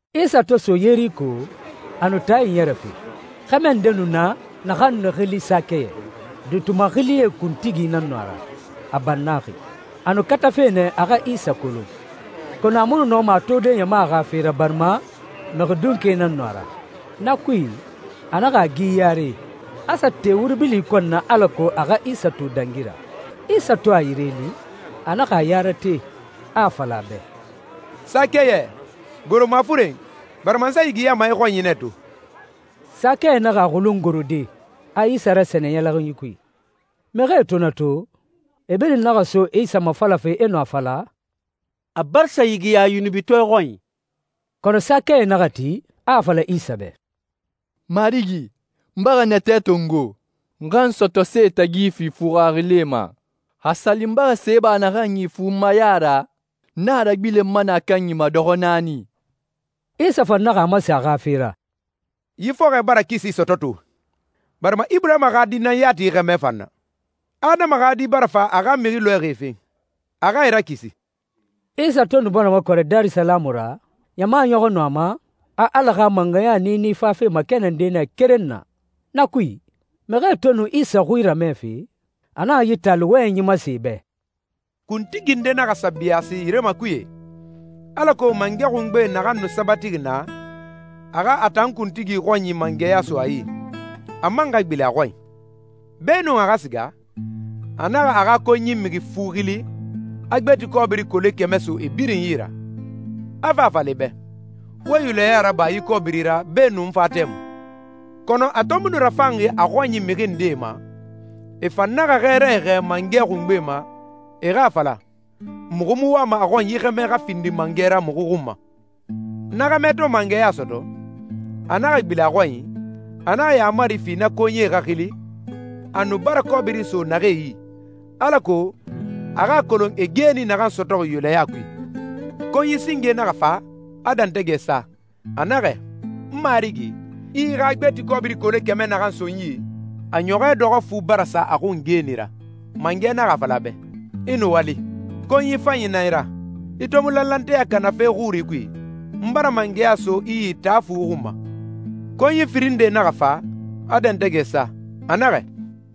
Isa to so Yeriko, a nu taa iɲɛrɛfe. Xɛmɛ nde nu na naxan nu xili Sakɛyɛ. Duuti maxilie kuntigi nan nu a ra, a bannaxi. A nu katafe nɛ a xa Isa kolon, kɔnɔ a mu nu nɔma a tode ɲama xa fe ra, barima mixi dunke nan nu a ra. Na kui, a naxa a gi yare, a sa te wuri bili kɔn na alako a xa Isa to dangi ra. Isa to a yire li, a naxa a ya rate, a a fala a bɛ, «Sakɛyɛ, goro mafuren, barima n sa yigiyama i xɔnyi nɛ to.» Sakɛyɛ naxa a xulun gorode, a Isa rasɛnɛ ɲɛlɛxinyi kui. Mixie to na to, e birin naxa so Isa mafalafe, e nu a fala, «A bara sa yigiya yunubitɔɛ xɔnyi.» Kɔnɔ Sakɛyɛ naxa ti, a a fala Isa bɛ, «Marigi, n bara natɛ tongo, n xa n sɔtɔse tagi fima nɛ fuxarilae ma. Xa a sa li n bara se ba naxan yi funmaya ra, n a ragbilenma nɛ a kanyi ma dɔxɔ naani.» Isa fan naxa a masen a xa fe ra, «Yi fɔxɔɛ bara kisi sɔtɔ to, barima Iburahima xa di nan na yi xɛmɛ fan na. Adama xa Di bara fa a xa mixi lɔɛxie fen, a xa e rakisi.» Isa to nu bara makɔrɛ Darisalamu ra, ɲama ɲɔxɔ nu a ma, a Ala xa mangɛya niini fafe makɛnɛnde nɛ keren na. Na kui, mixie to nu Isa xui ramɛfe, a naxa yi taali wɔyɛnyi masen e bɛ. «Kuntigi nde naxa sa biyaasi yire makuye, alako mangɛ xungbe naxan nu sabatixi naa, a xa a tan kuntigi xɔnyi mangɛya so a yi, a man xa gbilen a xɔnyi. Beenun a xa siga, a naxa a xa konyi mixi fu xili, a gbeti kɔbiri kole kɛmɛ so e birin yi ra, a fa a fala e bɛ, ‹Wo yulɛya raba yi kɔbiri ra beenun n fa tɛmui.›» «Kɔnɔ a to mu nu rafanxi a xɔnyi mixi ndee ma, e fan naxa xɛɛrae xɛɛ mangɛ xungbe ma, e xa a fala, ‹Muxu mu wama a xɔn yi xɛmɛ xa findi mangɛ ra muxu xun ma.›» «Na xɛmɛ to mangɛya sɔtɔ, a naxa gbilen a xɔnyi. A naxa yaamari fi na konyie xa xili, a nu bara kɔbiri so naxee yi, alako a xa a kolon e geeni naxan sɔtɔxi yulɛya kui. Konyi singe naxa fa, a dɛntɛgɛ sa, a naxɛ, ‹N marigi, i i xa gbeti kɔbiri kole kɛmɛ naxan so nɛ n yi, a ɲɔxɔɛ dɔxɔ fu bara sa a xun geeni ra.› Mangɛ naxa a fala a bɛ, ‹I nuwali! Konyi fanyi nan i ra! I to mu lanlanteya kana fe xuri kui, n bara mangɛya so i yi taa fu xun ma.›» «Konyi firin nde naxa fa, a dɛntɛgɛ sa, a naxɛ,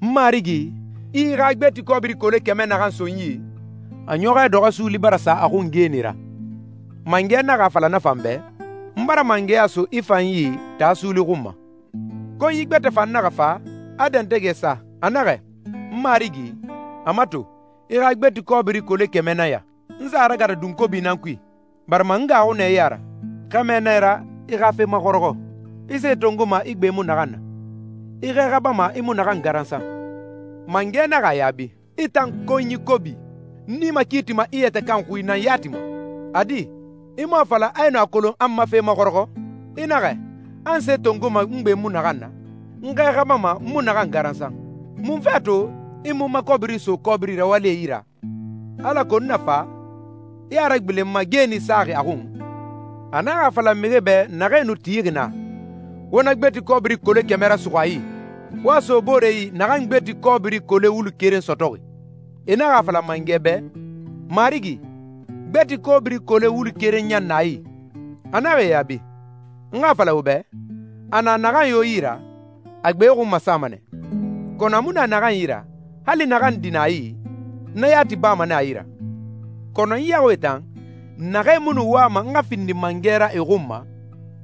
‹N Marigi, i i xa gbeti kɔbiri kole kɛmɛ naxan so nɛ n yi, a ɲɔxɔɛ dɔxɔ suuli bara sa a xun geeni ra.› Mangɛ naxa a fala na fan bɛ, ‹N bara mangɛya so i fan yi taa suuli xun ma!›» «Konyi gbɛtɛ fan naxa fa, a dɛntɛgɛ sa, a naxɛ, ‹N marigi, a mato, i xa gbeti kɔbiri kole kɛmɛ nan ya. N sa a ragata dunkobi nan kui, barima n gaaxu nɛ i ya ra. Xɛmɛ nan i ra, i xa fe maxɔrɔxɔ. I se tongoma i gbe mu naxan na. I xɛ xabama i mu naxan garansan.› Mangɛ naxa a yaabi, ‹I tan konyi kobi, n i makiitima i yɛtɛ kan xui nan yati ma! A di, i mu a fala a i nu a kolon a n ma fe maxɔrɔxɔ? I naxɛ, a n se tongoma n gbe mu naxan na, n xɛ xabama n mu naxan garansan. Munfe a to i mu n ma kɔbiri so kɔbiri rawalie yi ra, alako n na fa, i a ragbilen n ma geeni saxi a xun?› A naxa a fala mixie bɛ naxee nu tixi na, ‹Wo na gbeti kɔbiri kole kɛmɛ rasuxu a yi, wo a so boore yi naxan gbeti kɔbiri kole wulu keren sɔtɔxi.› E naxa a fala mangɛ bɛ, ‹Marigi, gbeti kɔbiri kole wulu keren ɲan na a yi!› A naxa e yaabi, ‹N xa a fala wo bɛ, a na naxan yo yi ra, a gbe xun masama nɛ. Kɔnɔ a mu na naxan yi ra, hali naxan di na a yi, na yati bama nɛ a yi ra. Kɔnɔ n yaxuie tan, naxee mu nu wama n xa findi mangɛ ra e xun ma,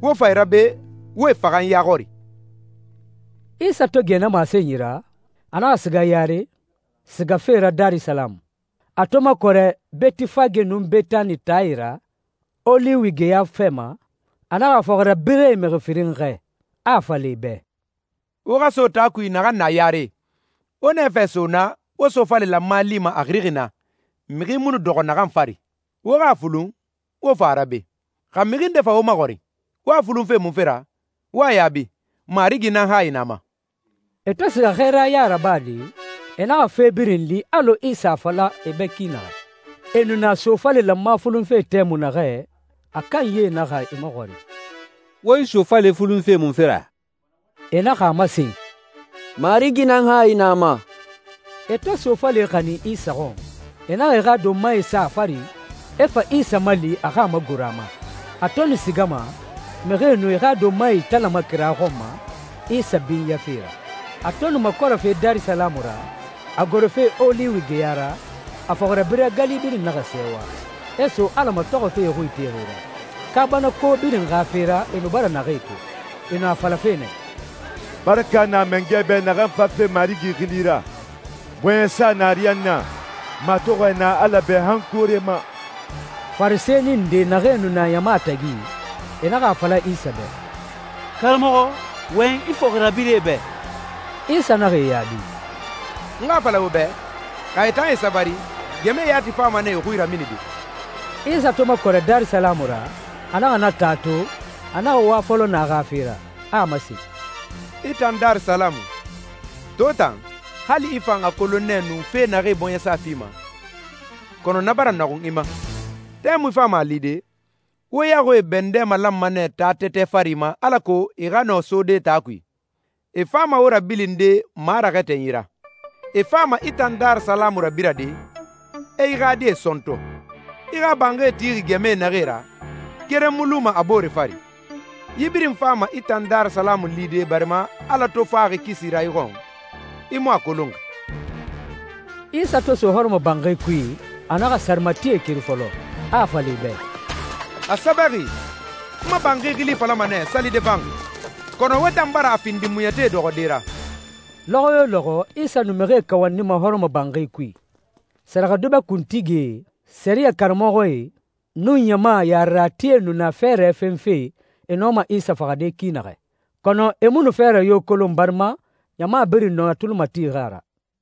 wo fa e ra be, wo e faxa n ya xɔri.›» Isa to gɛ na masenyi ra, a naxa siga yare, sigafe ra Darisalamu. A to makɔrɛ Betifage nun Betani taae ra, Oliwi geya fɛ ma, a naxa a fɔxirabirɛe mixi firin xɛɛ, a a fala e bɛ, «Wo xa so taa kui naxan na yare. Wo nɛfɛ so naa, wo sofale lanma lima a xirixi naa, mixi mu nu dɔxɔ naxan fari. Wo xa a fulun, wo fa a ra be. Xa mixi nde fa wo maxɔrin, ‹Wo a fulunfe munfe ra› wo xa a yaabi, ‹Marigi nan hayi na a ma.›» E to siga xɛɛraya rabade, e naxa fe birin li alɔ Isa a fala e bɛ ki naxɛ. E nu na sofale lanma fulunfe tɛmui naxɛ, a kanyie naxa e maxɔrin, «Wo yi sofale fulunfe munfe ra?» E naxa a masen, «Marigi nan hayi na a ma.» E to sofale xanin Isa xɔn, e naxa e xa donmae sa a fari, e fa Isa mali a xa a magoro a ma. A to nu sigama, mixie nu e xa donmae italama kira xɔn ma, Isa binyafe ra. A to nu makɔrɛfe Darisalamu ra, a gorofe Oliwi geya ra, a fɔxirabirɛ gali birin naxa sɛɛwa, e so Ala matɔxɔfe e xui itexi ra kaabanako birin xa fe ra e nu bara naxee to. E nu a falafe nɛ, «Baraka na Mangɛ bɛ naxan fafe Marigi xili ra! Bɔɲɛsa na ariyanna, matɔxɔɛ na Ala bɛ han koore ma!» Farisɛni nde naxee nu na ɲama tagi, e naxa a fala Isa bɛ, «Karamɔxɔ, wɔyɛn i fɔxirabirɛe bɛ!» Isa naxa e yaabi, «N xa a fala wo bɛ, xa e tan e sabari, gɛmɛe yati fama nɛ e xui raminide.» Isa to makɔrɛ Darisalamu ra, a naxa na taa to, a naxa wa fɔlɔ naa xa fe ra, a a masen, «I tan Darisalamu, to tan, hali i fan a kolon nɛ nu fee naxee bɔɲɛsa fima! Kɔnɔ na bara nɔxun i ma. Tɛmui fama a lide, wo yaxuie bɛndɛ malanma nɛ taa tɛtɛ fari ma alako e xa nɔ sode taa kui. E fama wo rabilinde maraxɛtɛnyi ra. E fama i tan Darisalamu rabirade, e i xa die sɔntɔ. I xa banxie tixi gɛmɛe naxee ra, keren mu luma a boore fari. Yi birin fama i tan Darisalamu lide barima Ala to faxi kisi ra i xɔn, i mu a kolonxi.» Isa to so hɔrɔmɔbanxi kui, a naxa sarematie keri fɔlɔ, a a fala e bɛ, «A sɛbɛxi, ‹N ma banxi xili falama nɛ, salide banxi,› kɔnɔ wo tan bara a findi muɲɛtie dɔxɔde ra.» Lɔxɔ yo lɔxɔ Isa nu mixie kawandima hɔrɔmɔbanxi kui. Sɛrɛxɛdubɛ kuntigie, sɛriyɛ karamɔxɔe, nun ɲama yareratie nu na fɛɛrɛ fenfe e nɔma Isa faxade ki naxɛ. Kɔnɔ e mu nu fɛɛrɛ yo kolon barima ɲama birin nu a tuli matixi a ra.